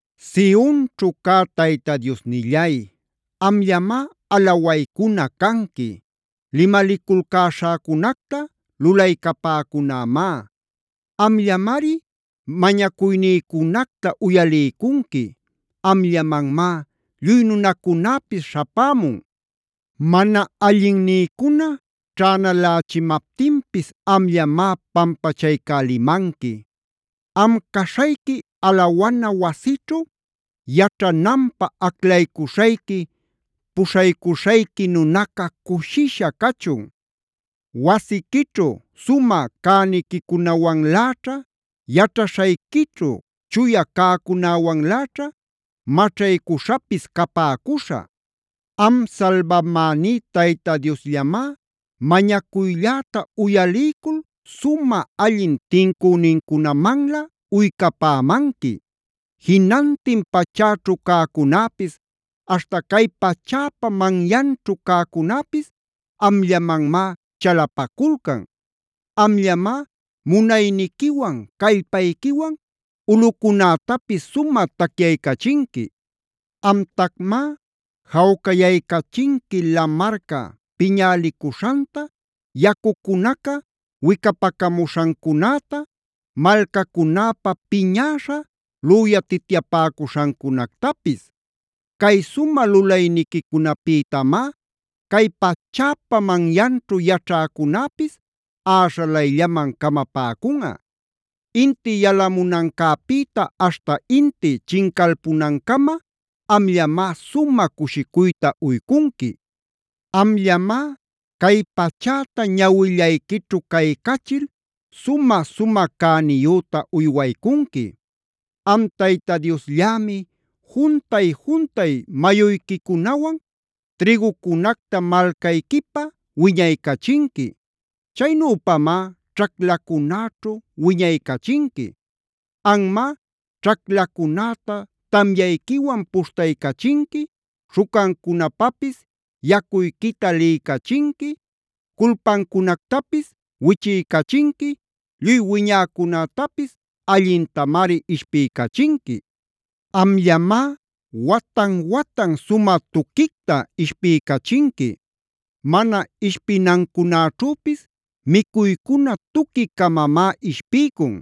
Sionćhu cä Tayta Diosnillay, amllamá alawaycuna canqui. Limaliculcäśhäcunacta lulaycapäcunämá. Amllamari mañacuynïcunacta uyaliycunqui. Amllamanmá lluy nunacunäpis śhapämun. Mana allinnïcuna ćhänalächimaptinpis amllamá pampachaycälimanqui. Am caśhayqui alawana wasićhu yaćhananpä aclaycuśhayqui, puśhaycuśhayqui nunaca cushisha cachun. Wasiquićhu sumä cäniquicunawanläćha, yaćhaśhayquićhu chuya cäcunäwanläćha maćhaycuśhapis capäcuśhä. Am salbamäní Tayta Diosllamá mañacuylläta uyaliycul sumä allin tincünincunamanlä uycapämanqui. Jinantin pachäćhu cäcunäpis, aśhta cay pachäpa manyanćhu cäcunäpis amllamanmá chalapaculcan. Amllamá munayniquiwan, callpayquiwan ulꞌucunätapis sumä tacyaycachinqui. Amtacmá jawcayaycachinqui lamarca piñälicuśhanta, yacucunaca wicapacamuśhancunäta, malcacunäpa piñäśha lüyatityapäcuśhancunactapis. Cay sumä lulayniquicunäpïtamá cay pachäpa manyanćhu yaćhäcunäpis äśhalayllaman camapäcunꞌa. Inti yalamunancäpïta aśhta inti chincalpunancama amllamá sumä cushicuyta uycunqui. Amllamá cay pachäta ñawillayquićhu caycachil sumä-sumä cäniyüta uywaycunqui.a Am Tayta Diosllämi juntay-juntay mayuyquicunawan trïgucunacta malcayquipä wiñaycachinqui. Chaynüpamá ćhaclacunäćhu wiñaycachinqui. Anmá ćhaclacunäta tamyayquiwan puśhtaycachinqui, śhucancunapapis yacuyquita liycachinqui, culpancunactapis wichiycachinqui, lluy wiñäcunätapis allintamari ishpiycachinqui. Amllamá watan-watan sumä tuquicta ishpiycachinqui. Mana ishpinancunäćhüpis micuycuna tuqui-camamá ishpiycun.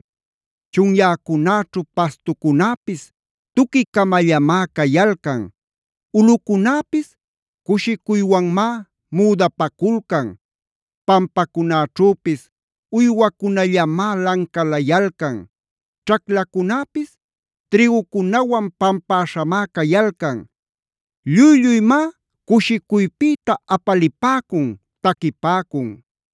Chunyäcunäćhu pastucunäpis tuqui-camallamá cayalcan. Ulꞌucunäpis cushicuywanmá müdapaculcan. Pampacunäćhüpis uywacunallamá lancalayalcan. Ćhaclacunäpis trïgucunawan pampäśhamá cayalcan. ¡Lluy-lluymá cushicuypïta apalipäcun, taquipäcun!